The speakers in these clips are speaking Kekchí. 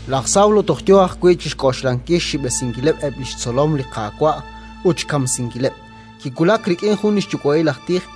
Laj Sawlo toj yo ajwi' chi xk'oxlankil xxib'esinkil eb' li xtzolom li Qaawa' ut xkamsinkileb', kiwulak rik'in li xyuwa'il aj tij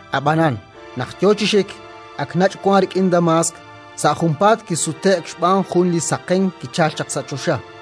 Ab'anan, naq yo chi xik, ak nach' wank rik'in Damaask, sa' junpaat kisute'k xb'aan jun li saqenk kichalk chaq sa' choxa.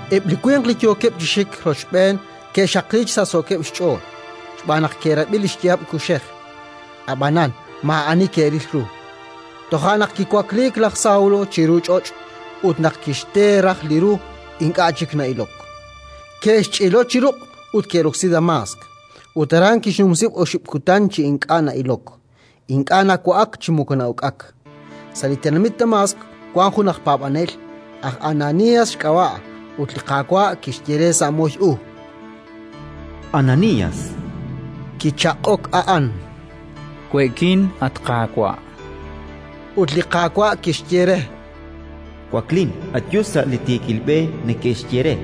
Eb' li winq li yookeb' chi xik rochb'een ke'xaqliik chi sachsookeb' xch'ool, xb'aan naq ke'rab'i li xyaab' kuxej, ab'anan maa'ani ke'ril ru. Toja' naq kiwakliik laj Sawlo chiru ch'och', ut naq kixte raj li ru, ink'a' chik na'ilok. Ke'xch'ilo chi ruq' ut ke'roksi Damaask; ut aran kixnumsi oxib' kutan chi ink'a' na'ilok, ink'a' nawa'ak chi moko na'uk'ak. Sa' li tenamit Damaask wank jun aj paab'anel, aj Ananías xk'ab'a', ut li Qaawa' kixye re sa' moy u: “Ananías!”. Kichaq'ok a'an: “We'kin, at Qaawa'”, chan. Ut li Qaawa' kixye re: “Waklin, ayu sa' li Tiikil B'e neke'xye re,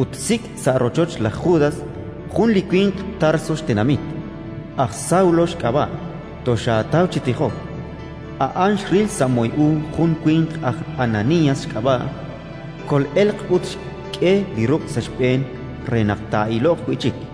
ut sik' sa' rochoch laj Judas jun li winq Tarso xtenamit, aj Sawlo xk'ab'a'. Toxaataw chi tijok. A'an xril sa' moy u jun li winq aj Ananías xk'ab'a', kol'elq ut xk'e li ruq' sa' xb'een re naq taa'iloq wi' chik”.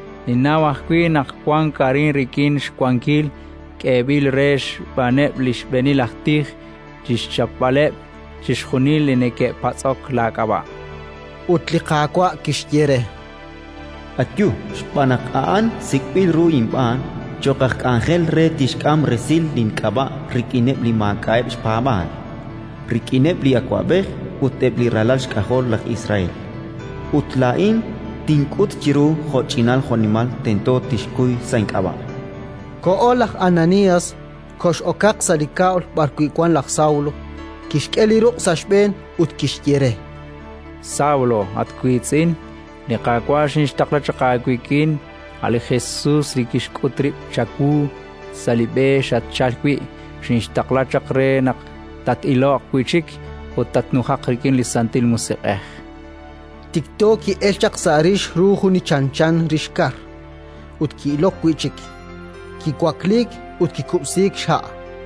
Ninnaw ajwi' naq wank arin, rik'in xwankil k'eeb'il re xb'aaneb' li xb'eenil aj tij chi xchapb'aleb' chixjunil li neke'patz'ok laak'ab'a'”. Ut li Qaawa' kixye re: “Ayu, xb'aan naq a'an sik'b'il ru inb'aan cho'q aj k'anjel re tixk'am resil link'ab'a' rik'ineb' li maak'a'eb' xpaab'aal, rik'ineb' li awab'ej ut eb' li ralal xk'ajol laj Israel. Ut laa'in tink'ut chiru jo'ch'inal jo'nimal tento tixkuy sa' ink'ab'a'”. Koho laj Ananías, kox'okaq sa' li kab'l b'arwi' wank laj Sawlo, kixk'e li ruq' sa' xb'een ut kixye re: —Saúl, at wiitz'in, li Qaawa' xinxtaqla chaq aawik'in, a' li Jesus li xk'ut rib' chawu sa' li b'e xatchalk wi'. Xinxtaqla chaq, re naq tat iloq wi' chik ut tatnujaq rik'in Santil Musiq'ej. Tikto ki'elk sa' rix ru li chanchan rix kar, ut ki'ilok wi' chik; kiwakliik ut kikub'siik xha'.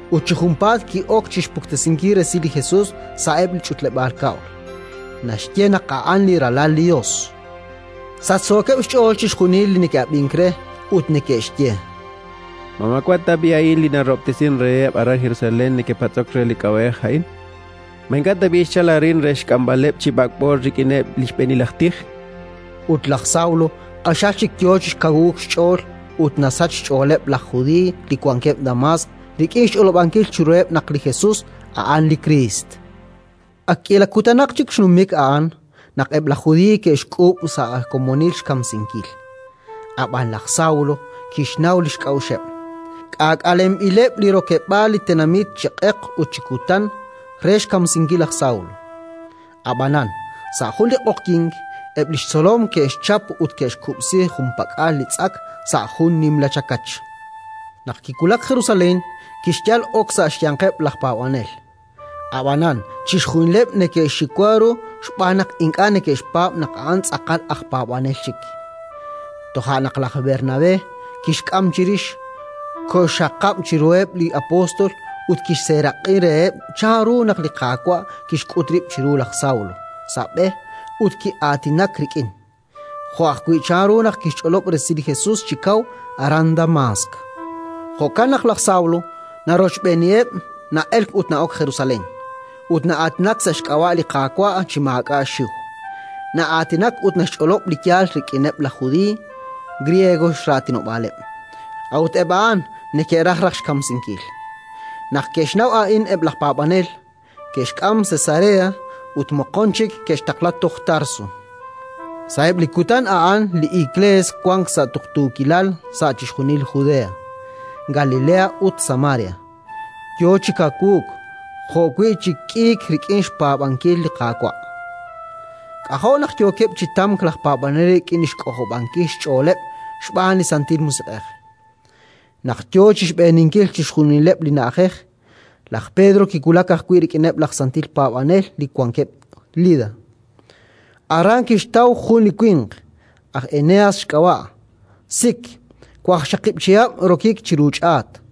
Ut chi junpaat ki'ok chi xpuktesinkil resil li Jesus sa'eb' li ch'utleb'aal kab'l: naxye naq a'an li Ralal li Yos. Sachsookeb' xch'ool chixjunil li neke'ab'ink re, ut neke'xye: —Ma maawa' tab'i' a'in li narahob'tesink reheb' aran Jerusalén li neke'patz'ok re li k'ab'a'ej a'in? Ma ink'a' tab'i' xchalk arin re xk'amb'aleb' chi b'ak'b'o rik'ineb' li xb'eenil aj tij? Ut laj Sawlo q'axal chik yo chi kawuuk xch'ool ut naxsach xch'ooleb' laj Judiiy li wankeb' Damaask rik'in xch'olob'ankil chiruheb' naq li Jesus a'an li Kriist. Ak k'iila kutankaq chik xnumik a'an naq eb' laj Judiiy ke'xk'uub' sa' komonil xkamsinkil. Ab'anan laj Sawlo kixnaw li xk'a'uxeb'. K'aak'alenb'ileb' li rokeb'aal li tenamit chi q'eq ut chi kutan re xkamsinkil laj Sawlo. Ab'anan, sa' jun li q'oqyink, eb' li xtzolom ke'xchap ut ke'xkub'si junpak'al li tz'ak sa' jun nimla chakach. Naq kiwulak Jerusalén, kixyal ok sa' xyanqeb' laj paab'anel, ab'anan chixjunileb' neke'xxiwa ru xb'aan naq ink'a' neke'xpaab' naq a'an tz'aqal aj paab'anel chik. Toja' naq laj Bernabé kixk'am chirix, koxxaqab' chiruheb' li apóstol ut kixseeraq'i reheb' chanru naq li Qaawa' kixk'ut rib' chiru laj Sawlo sa' b'e ut ki'aatinak rik'in, jo' ajwi' chanru naq kixch'olob' resil li Jesus chi kaw, aran Damaask. Jo'kan naq laj Sawlo narochb'eeniheb', na'elk ut na'ok Jerusalén, ut na'aatinak sa' xk'ab'a' li Qaawa' chi maak'a' xxiw. Na'aatinak ut naxch'olob' li yaal rik'ineb' laj Judiiy, griego raatinob'aaleb'; a'ut eb' a'an neke'raj raj xkamsinkil. Naq ke'xnaw a'in eb' laj paab'anel, ke'xk'am Cesarea ut moqon chik ke'xtaqla toj Tarso. Sa'eb' li kutan a'an li Iklees wank sa' tuqtuukilal sa' chixjunil Judea, Galilea ut Samaria; yo chi kawuuk jo'wi' chi k'iik rik'in xpaab'ankil li Qaawa'. K'ajo' naq yookeb' chi tamk laj paab'anel rik'in li xk'ojob'ankil xch'ooleb' xb'aan li Santil Musiq'ej. Naq yo chi xb'eeninkil chixjunileb' li na'ajej, laj Pedro kiwulak ajwi' rik'ineb' laj santil paab'anel li wankeb' Lida. Aran kixtaw jun li winq, aj Eneas xk'ab'a', sik, waqxaqib' chihab' rokik chiru ch'aat.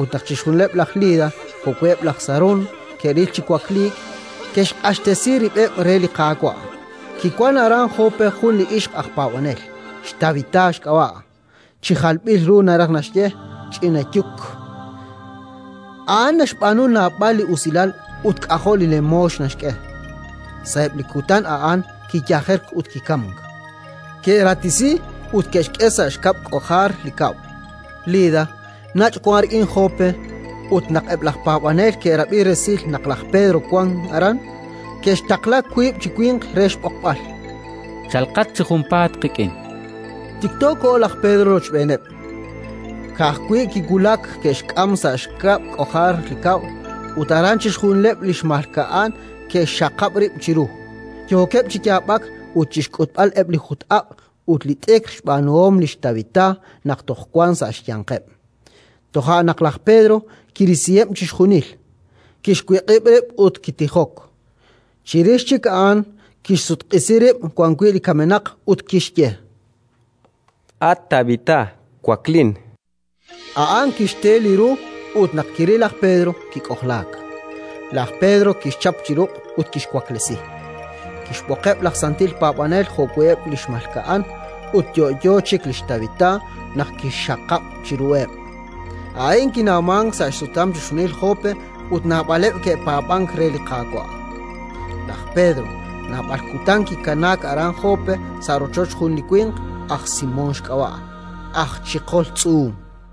Ut naq chixjunileb' laj Lida jo'wi' eb' laj Sarón ke'ril chi wakliik, ke'xq'axtesi rib'eb' re li Qaawa'. Kiwank aran Jope jun li ixq aj paab'anel, xTabitá xk'ab'a' (chi jalb'il ru naraj naxye: “Ch'ina Yuk”). A'an naxb'aanu naab'al li usilal ut k'ajo' li lemoox naxk'e. Sa'eb' li kutan a'an kiyajerk ut kikamk. Ke'ratisi ut ke'xk'e sa' xkab' k'ojar li kab'l. Lida nach' wank rik'in Jope ut, naq eb' laj paab'anel ke'rab'i resil naq laj Pedro wank aran, ke'xtaqla wiib' chi winq re xb'oqb'al: “Chalqat chi junpaat qik'in”, chankeb' re. Tikto koho laj Pedro rochb'eeneb'. Ka'ajwi' kiwulak, ke'xk'am sa' xkab' k'ojar li kab'l ut aran chixjunileb' li xmalka'an ke'xxaqab' rib' chiru, yookeb' chi yaab'ak ut chi xk'utb'al eb' li jut-aq' ut li t'ikr xb'aanuhom lix Tabitá naq toj wank sa' xyanqeb'. Toja' naq laj Pedro kirisiheb' chixjunil, kixwiq'ib' rib' ut kitijok. Chirix chik a'an kixsutq'isi rib' wan wi' li kamenaq ut kixye: —At Tabitá, waklin! A'an kixte li ru ut, naq kiril laj Pedro, kik'ojlaak. Laj Pedro kixchap chi ruq' ut kixwaklesi; kixb'oqeb' laj santil paab'anel jo'wi' eb' li xmalka'an, ut yo'yo chik lix Tabitá naq kixxaqab' chiruheb'. A'in kinawmank sa' xsutam chixjunil Jope, ut naab'aleb' ke'paab'ank re li Qaawa'. Laj Pedro naab'al kutan kikanaak aran Jope sa' rochoch jun li winq, aj Simón xk'ab'a', aj chiqol tz'uum.